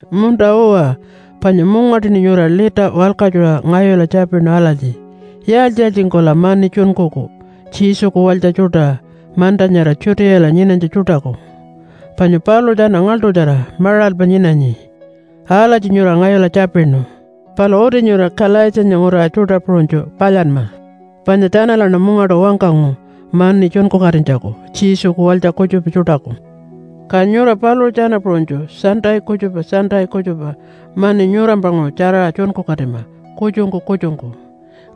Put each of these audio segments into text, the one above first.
Munta-uwa, panya mungaṯuṉi nyura lita walkatjuṟa ngayula tjapinu alatji, “Yaaltji-yaaltjingkula mani tjunkuku Jesuku Walytja tjuṯa manta nyara Judeala nyinanytja tjuṯaku? Panya paluṟu tjana ngaḻṯutjara maṟalpa nyinanyi.” Alatji nyura ngayula tjapinu. Palu uti nyura Kalaitjiyanya nguraṟa tjuṯa puṟunytju palyanma, panya tjanalaṉa mungaṯu wangkangu mani tjunkukatinytjaku Jesuku walytja kutjupa tjuṯaku. Ka nyura paluṟu tjana puṟunytju Sunday kutjupa Sunday kutjupa mani nyurampanguṟu tjaraṟa tjunkukatima kutjungku kutjungku.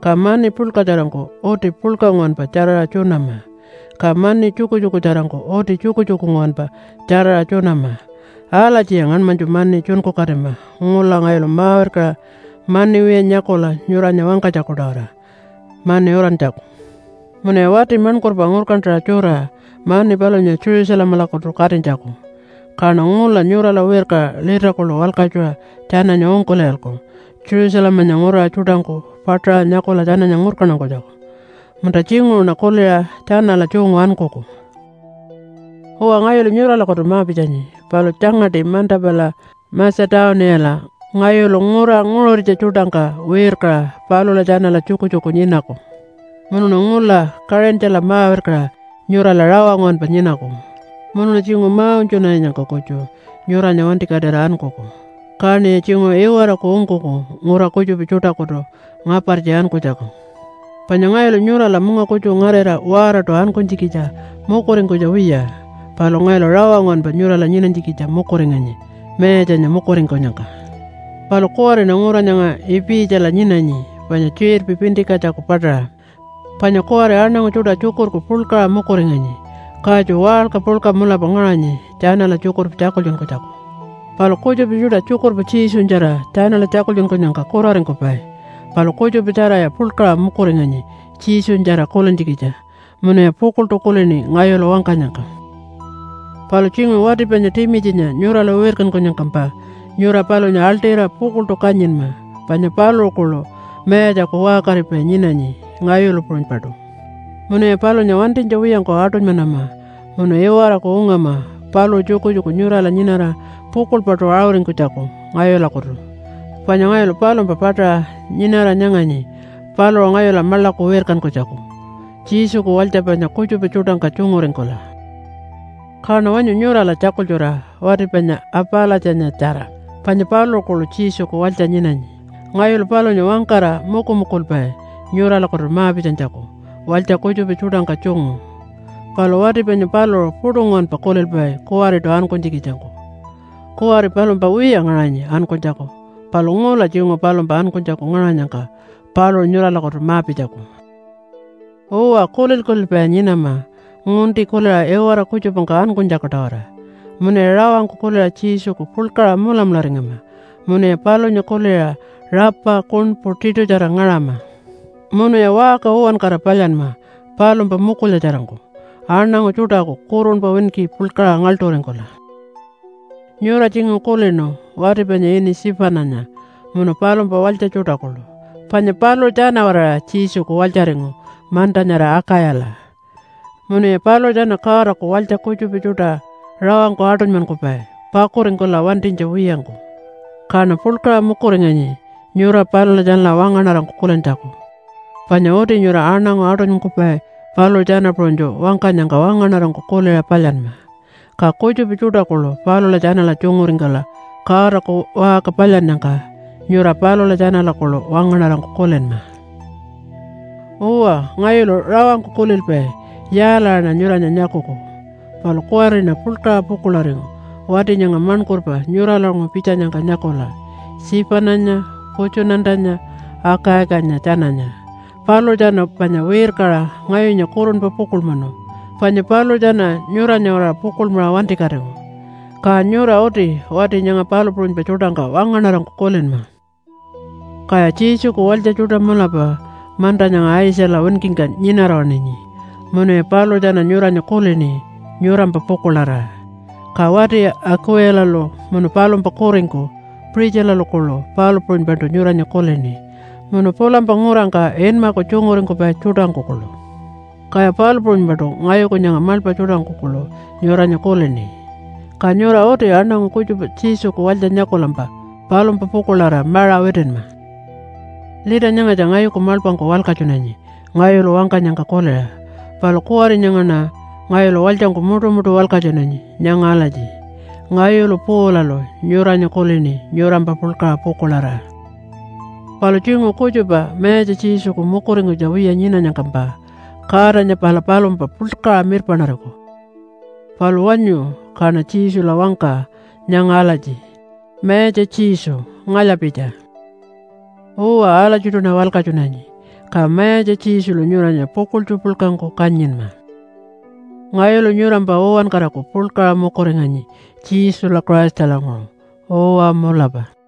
Ka mani puḻkatjarangku uti puḻka nguwanpa tjaraṟa tjunama, ka mani tjukutjukutjarangku uti tjukutjuku nguwanpa tjaraṟa tjunama. Alatjiya ngaṉmanytju mani tjunkukatima ngula ngayulu ma-wirkaṟa mani wiya nyakula nyuranya wangkanytjaku-tawara mani urantjaku. Munuya wati maṉkurpa ngurkantaṟa tjura mani palunya Jerusalemalakutu katinytjaku. Kaṉa ngula nyurala wirkaṟa lita kuḻu walkatjuṟa tjananya ungkul'iyalku Jerusalemanya nguraṟa tjuṯangku paṯaṟa nyakula tjananya ngurkantankunytjaku. Munta, tjinguṟuṉa kuliṟa tjanala tjungu ankuku. Uwa, ngayulu nyuralakutu ma-pitjanyi, palu tjangaṯi manta pala Matja-tuniyala ngayulu ngura nguṟuritja tjuṯangka wirkaṟa palula tjanala tjukutjuku nyinaku. Munuṉa ngula Kaṟintjala ma-wirkaṟa nyurala rawa nguwanpa nyinaku. Munuṉa tjinguṟu ma-unytjunarinyangka kutju nyuranya wantikatira ankuku. Kaṉiya tjinguṟu iwaraku ungkuku ngura kutjupa tjuṯakutu ngapartji ankunytjaku. Panya ngayulu nyurala munga kutju ngarira waaraṯu ankunytjikitja mukuringkunytja wiya. Palu ngayulu rawa nguwanpa nyurala nyinanytjikitja mukuringanyi Mayatjanya mukuringkunyangka. Palu kuwariṉa ngura nyanga Ipitjala nyinanyi panya tjiṟirpi Pintikatjaku paṯaṟa. Panya kuwari aṉangu tjuṯa tjukurku puḻkaṟa mukuringanyi, katju waṟka puḻka mulapa ngaṟanyi tjanala tjukurpa tjakultjunkunytjaku. Palu kutjupa tjuṯa tjukurpa Jesunyatjara tjanala tjakultjunkunyangka kuraringkupai. Palu kutjupa tjaraya puḻkaṟa mukuringanyi Jesunyatjara kulintjikitja munuya pukuḻṯu kulini ngayulu wangkanyangka. Palu tjinguṟu wati panya Timitjinya nyurala wirkankunyangkampa nyura palunya aḻṯira pukuḻṯu kanyinma, panya paluṟu kuḻu Mayatjaku waṟkaripai nyinanyi ngayulu puṟunypaṯu. Munuya palunya wantinytja wiyangku aṯunymanama munu iwaraku ungama paluṟu tjukutjuku nyurala nyinara pukuḻpaṯu aṟuringkunytjaku ngayulakutu. Panya ngayulu palumpa paṯaṟa nyinara nyanganyi paluṟu ngayula maḻaku wirkankunytjaku Jesuku walytja panya kutjupa tjuṯangka tjunguringkula. Kaṉa wanyu nyurala tjakultjura wati panya Apalatjanyatjara, panya paluṟu kuḻu Jesuku walytja nyinanyi. Ngayulu palunya wangkara mukumukulpai nyuralakutu ma-pitjanytjaku walytja kutjupa tjuṯangka tjungu. Palu wati panya paluṟu puṯu nguwanpa kulilpai kuwariṯu ankunytjikitjangku. Kuwari palumpa wiya ngaṟanyi ankunytjaku palu ngula tjinguṟu palumpa ankunytjaku ngaṟanyangka paluṟu nyuralakutu ma-pitjaku. Uwa, kulil-kulilpaya nyinama ngunti kuliṟa iwara kutjupangka ankunytjaku-tawara. Munuya rawangku kuliṟa Jesuku puḻkaṟa mulamularingama. Munuya palunya kuliṟa rapa kuṉpu tiṯutjara ngaṟama. Munuya waṟka uwankara palyanma palumpa mukulyatjarangku, aṉangu tjuṯaku kurunpa winki puḻkaṟa ngaḻṯuringkula. Nyura tjinguṟu kulinu wati panya ini Tjipananya munu palumpa walytja tjuṯa kuḻu, panya paluṟu tjana-waraṟa Jesuku walytjaringu manta nyara Akayala. Munuya paluṟu tjana Godaku walytja kutjupa tjuṯa rawangku aṯunymankupai pakuringkula wantinytja wiyangku. Kaṉa puḻkaṟa mukuringanyi nyura palula tjanala wangaṉarangku kulintjaku. Panya uti nyura aṉangu aṯunymankupai paluṟu tjana puṟunytju wangkanyangka wangaṉarangku kuliṟa palyanma. Ka kutjupa tjuṯa kuḻu palula tjanala tjunguringkula Godaku waṟka palyannyangka nyura palula tjanala kuḻu wangaṉarangku kulinma. Uwa, ngayulu rawangku kulilpai, “Yaalaṟaṉa nyuranya nyakuku.” Palu kuwariṉa puḻkaṟa pukuḻaringu wati nyanga maṉkurpa nyuralanguṟu pitjanyangka nyakula Tjipananya, Putjunatanya, Akaikanya tjananya. Paluṟu tjana panya wirkaṟa ngayunya kurunpa pukuḻmanu panya paluṟu tjana nyuranya-waraṟa pukuḻmaṟa wantikatingu. Ka nyura uti wati nyanga palu puṟunypa tjuṯangka wangaṉarangku kulinma. Kaya Jesuku walytja tjuṯa mulapa manta nyanga Aitjala winkingka nyinara waṉinyi munuya paluṟu tjana nyuranya kulini nyurampa pukuḻarira. Ka wati Akuwilalu munu palumpa kuringku Puṟitjilalu kuḻu palu puṟunypaṯu nyuranya kulini, munu pulampa ngurangka inmaku tjunguringkupai tjuṯangku kuḻu. Kaya palu puṟunypaṯu ngayuku nyanga maḻpa tjuṯangku kuḻu nyuranya kulini. Ka nyura uti aṉangu kutjupa Jesuku walytja nyakulampa palumpa pukuḻarira maṟa witinma. Lita nyangatja ngayuku maḻpangku walkatjunanyi ngayulu wangkanyangka kuliṟa. Palu kuwari nyangaṉa ngayulu walytjangku muṯumuṯu walkatjunanyi nyanga alatji, “Ngayulu Paulalu nyuranya kulini nyurampa puḻkaṟa pukuḻarira.” Palu tjinguṟu kutjupa Mayatja Jesuku mukuringkunytja wiya nyinanyangkampa Godanya pala palumpa puḻkaṟa mirpaṉariku. Palu wanyu kaṉa Jesula wangka nyanga alatji, “Mayatja Jesu, ngalya-pitja.” Uwa alatjiṯuṉa walkatjunanyi. Ka Mayatja Jesulu nyuranya pukuḻtju puḻkangku kanyinma. Ngayulu nyurampa uwankaraku puḻkaṟa mukuringanyi Jesula Christalanguṟu. Uwa mulapa.